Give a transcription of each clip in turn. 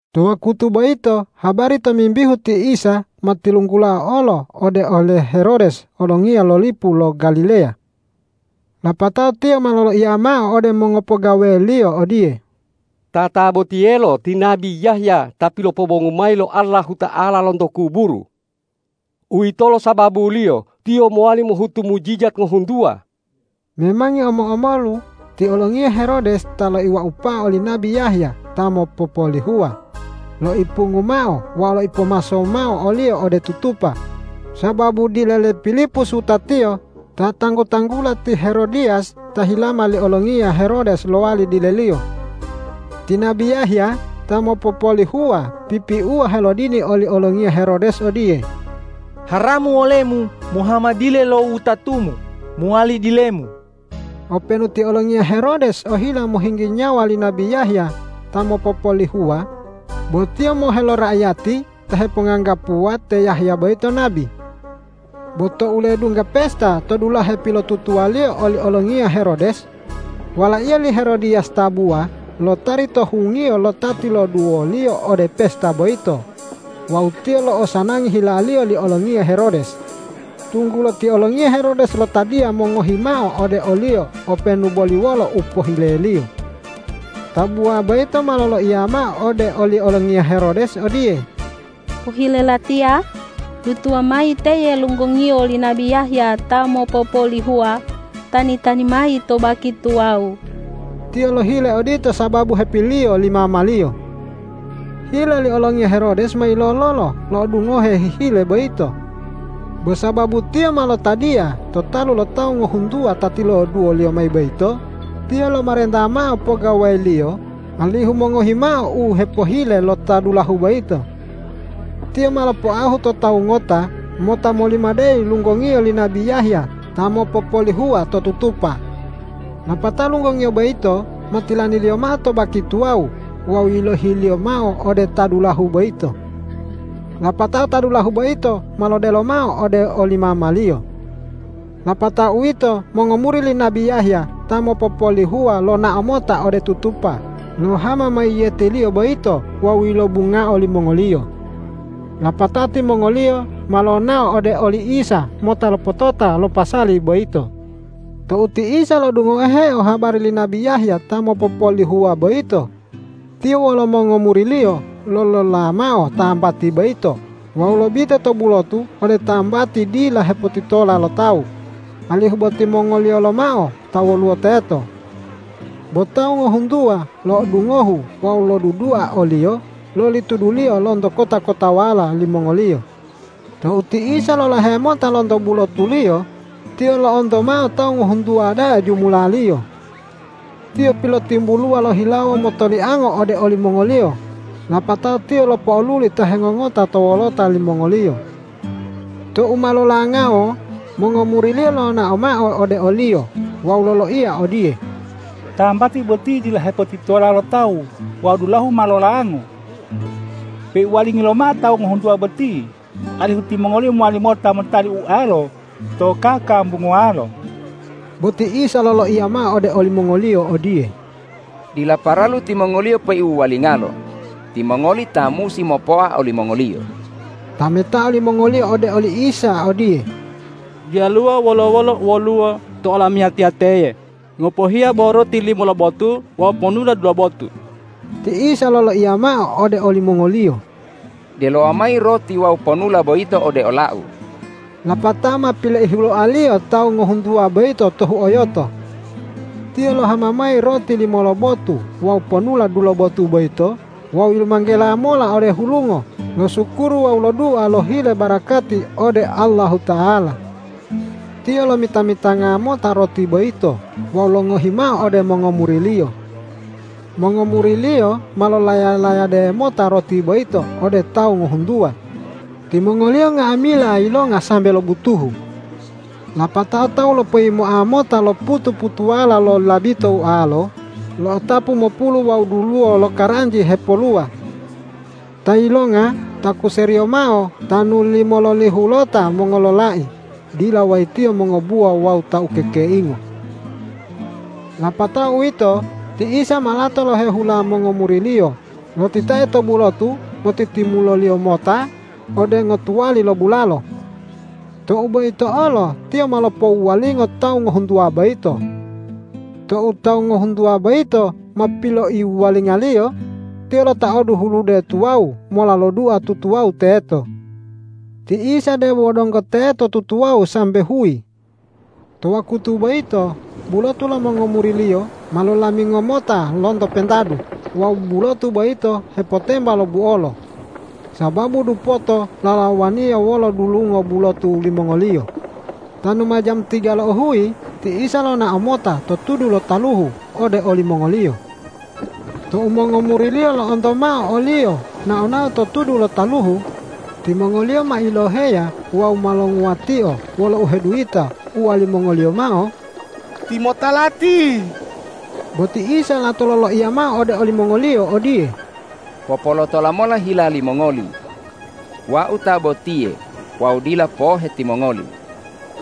To wakutu boyito habari tomimbihu ti Isa ma tilunggulao olo ode ole Herodes olongiya lo lipu lo Galileya. Lapatao tiyo ma loloiya mao ode mongopogaweliyo odiye,”Tatabotiyelo ti nabi Yahya ta pilopobongu mayi lo Allahuta'ala lonto kuburu. Uwitolo sababuliyo Tiyo mowali mohutu mujijat ngohuntuwa.” Memangi omo-omolu ti olongiya Herodes ta loiwaupao oli nabi Yahya ta mopopolihuwa, loipungu mao wawu loipopomaso mao oliyo ode tutupa sababu dile le Pilipus wutatiyo ta tanggu-tanggula ti Herodiyas ta hilama li olongiya Herodes lowali dileliyo. Ti nabi Yahya ta mopopolihuwa pipiuwa helodini oli olongiya Herodes odiye,”Haramu olemu mohama dile lo wutatumu mowali dilemu!” Openu ti olongiya Herodes ohila mohinggi nyawa li nabi Yahya ta mopopolihuwa, bo tiyo mohe lo raiyati ta heponganggapuwa te Yahya boyito nabi. Bo tou ledungga pesta to dulahe pilotutuwaliyo oli olongiya Herodes, walaiyo li Herodiyas tabuwa lotari to hungiyo lo ta tiloduwoliyo ode pesta boyito wawu tiyo lo'osanangi hilaliyo li olongiya Herodes, tunggulo ti olongiya Herodes lotadiya mongohi mao ode oliyo openu boli wolo u pohileliyo. Tabuwa boyito ma loloiya mao ode oli olongiya Herodes odiye,”Pohile latiya, dutuwa mayi teye lunggongiyo li nabi Yahya ta mopopolihuwa tani-tani mayi to baki tuwawu.” Tiyo lohile odito sababu hepiliyo li mamaliyo. Hila li olongiya Herodes ma yilololo lo'odungoheo hihile boyito. Bo sababu tiyo ma lotadiya to talu lo tawu ngohuntuwa ta tiloduwoliyo mayi boyito, tiyo lomarenta mao pogaweliyo alihu mongohi mao u hepohile lo ta dulahu boyito. Tiyo ma lopoahu to tawu ngota mota molimadeyi lunggongiyo li nabi Yahya ta mopopolihuwa to tutupa. Lapatao lunggongiyo boyito ma tilaniliyo mao to baki tuwawu wawu yilohiliyo mao ode ta dulahu boyito. Lapatao ta dulahu boyito ma lodelo mao ode oli mamaliyo. Lapatao uwito mongomuri li nabi Yahya ta mopopolihuwa lonao mota ode tutupa lohama mayiyetiliyo boyito wawu yilobungao limongoliyo. Lapatao timongoliyo ma lonao ode oli Isa mota lopotota lo pasali boyito. Tou ti Isa lo'odungoheo habari li nabi Yahya ta mopopolihuwa boyito, Tiyo wolo mongomuri-Liyo lolola mao tambati boyito wawu lobite to bulotu ode tambati dila hepotitola lo tawu, alihu bo timongoliyo lomao ta woluwo teto. Bo tawu ngohuntuwa lo'odungohu wawu lodudua o-Liyo loli tuduliyo lonto kota-kotawala limongoliyo. Tou ti Isa lolahe mota lonto bulotu-Liyo, Tiyo lo'onto mao tawu ngohuntuwa da'a jumulaliyo. Tiyo pilotimbuluwa lohilawo motoliango ode olimongoliyo, lapatao Tiyo lopo'oluli ta hengongota to wolota limongoliyo. Tou ma lolangao mongomuri-Liyo lonao mao ode o-Liyo wawu loloiya odiye,”Tambati boti dila hepotitola lo tawu wawu dulahu ma lolango. Peiwuwalingi lomao tawu ngohuntuwa boti, alihu timongoliyo mowali mota motali ualo to kakambunguwalo.” Bo ti Isa loloiya mao ode olimongoliyo odiye,”Dila paralu timongoliyo peiwuwalingalo. Timongoli ta musi mopoa olimongoliyo.” Tametao limongoliyo ode oli Isa odiye,”Diyaluwo wolo-wolo u woluwo to olamiyatiya teye ngopohiya bo roti limo lobotu wawu ponula dulobotu.” Ti Isa loloiya mao ode olimongoliyo,”Delowa mayi roti wawu ponula boyito ode ola-U.” Lapatao ma pileihuloa-Liyo tawu ngohuntuwa boyito to huoyoto. Tiyo lohama mayi roti limo lobotu wawu ponula dulobotu boyito wawu yilumanggela mola ode hulungo losukuru wawu lodua lohile barakati ode Allahuta'ala. Tiyo lomita-mitanga mota roti boyito wawu longohi mao ode mongomuri-Liyo. Mongomuri-Liyo ma lolaya-layade mota roti boyito ode tawu ngohuntuwa. Timongoliyo nga'amila yilonga sambe lobutuhu. Lapatao tawu lopoyimoa mota lo putu-putuwala lo labito ualo, lo'otapu mopulu wawu duluwo lokaranji hepoluwa. Ta yilonga takuseriyo mao tanu limololihulota mongololai dila wayitiyo mongobuwa wawu ta ukekeingo. Lapatao uwito ti Isa ma lato lohehula mongomuri-Liyo lotitae to bulotu motitimulo-Liyo mota ode ngotuwali lo bulalo. Tou boyito olo Tiyo ma lopowuwalingo tawu ngohuntuwa boyito. Tou tawu ngohuntuwa boyito ma piloiwuwalinga-Liyo, Tiyo lotaodu hulude tuwawu mola lodua tutuwawu teto. Ti Isa debo donggo teto tutuwawu sambe huyi. To wakutu boyito bulotu lo mongomuri-Liyo ma lolamingo mota lonto pentadu wawu bulotu boyito hepotemba lo buolo, sababu dupoto lalawaniya wolo dulungo bulotu limongoliyo. Tanu ma jamu tiga lo uhuyi ti Isa lonao mota to tudu lo taluhu ode olimongoliyo. Tou mongomuri-Liyo lo'onto mao o-Liyo nao-nao to tudu lo taluhu, timongoliyo ma iloheya wawu ma longuwatio wolo uheduyita uwalimongoliyo mao,”Timota lati!” Bo ti Isa lato loloiya mao ode olimongoliyo odiye,”Popolotola mola hila limongoli. Wau ta botiye wawu dila pohe timongoli!”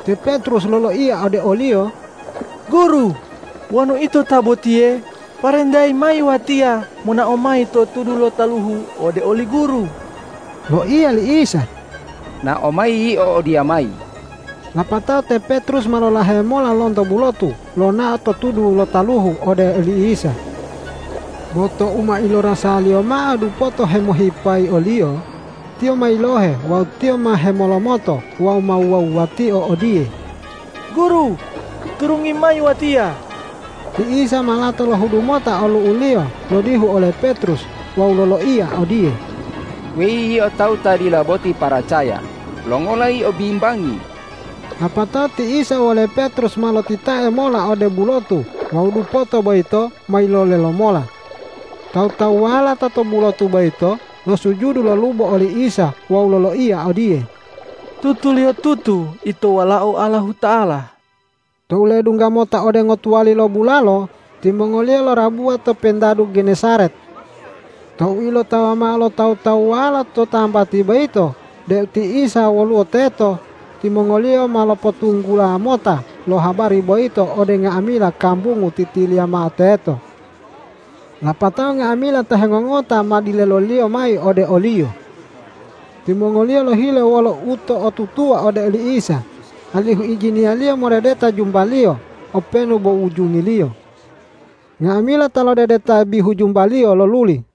Te Petrus loloiya ode o-Liyo,”Guru, wonu Ito ta botiye, parentayi mayi watiya monao mayi to tudu lo taluhu ode oli Guru.” Loiya li Isa,”Nao mayi yio odiyamayi!” Lapatao te Petrus ma lolahe mola lonto bulotu lonao to tudu lo taluhu ode oli Isa. Bo tou ma ilorasaliyo mao dupoto hemohipayi oliyo, tiyo ma yilohe wawu tiyo ma hemolomoto wawu ma wuwa-wuwatio odiye,”Guru, turungi mayi watiya!” Ti Isa ma lato lohudu mota olu'u-Liyo lodihu ole Petrus wawu loloiya odiye,”Weyi yio tawu ta dila boti paracaya, longola yio bimbangi?” Lapatao ti Isa wole Petrus ma lotitae mola ode bulotu wawu dupoto boyito ma yilole lomola. Tawu-tawuwala ta to bulotu boyito losujudu lolubo oli Isa wawu loloiya odiye,”Tutuliyotutu Ito Walao Allahuta'ala.” Tou ledungga mota ode ngotuwali lo bulalo, timongoliyo lorabuwa to pentadu Genesaret. Tou ilotawa mao lo tawu-tawuwala to tambati boyito deu ti Isa woluwo teto, timongoliyo ma lopotunggula mota lo habari boyito ode nga'amila kambungu titiliya mao teto. Lapatao nga'amila ta hengongota ma dileloliyo mayi ode o-Liyo. Timongoliyo lohile wolo uto'otutuwa ode oli Isa, alihu ijini-Liyo modedeta jumba-Liyo openu bo ujungiliyo. Nga'amila ta lodedeta bihu jumba-Liyo loluli.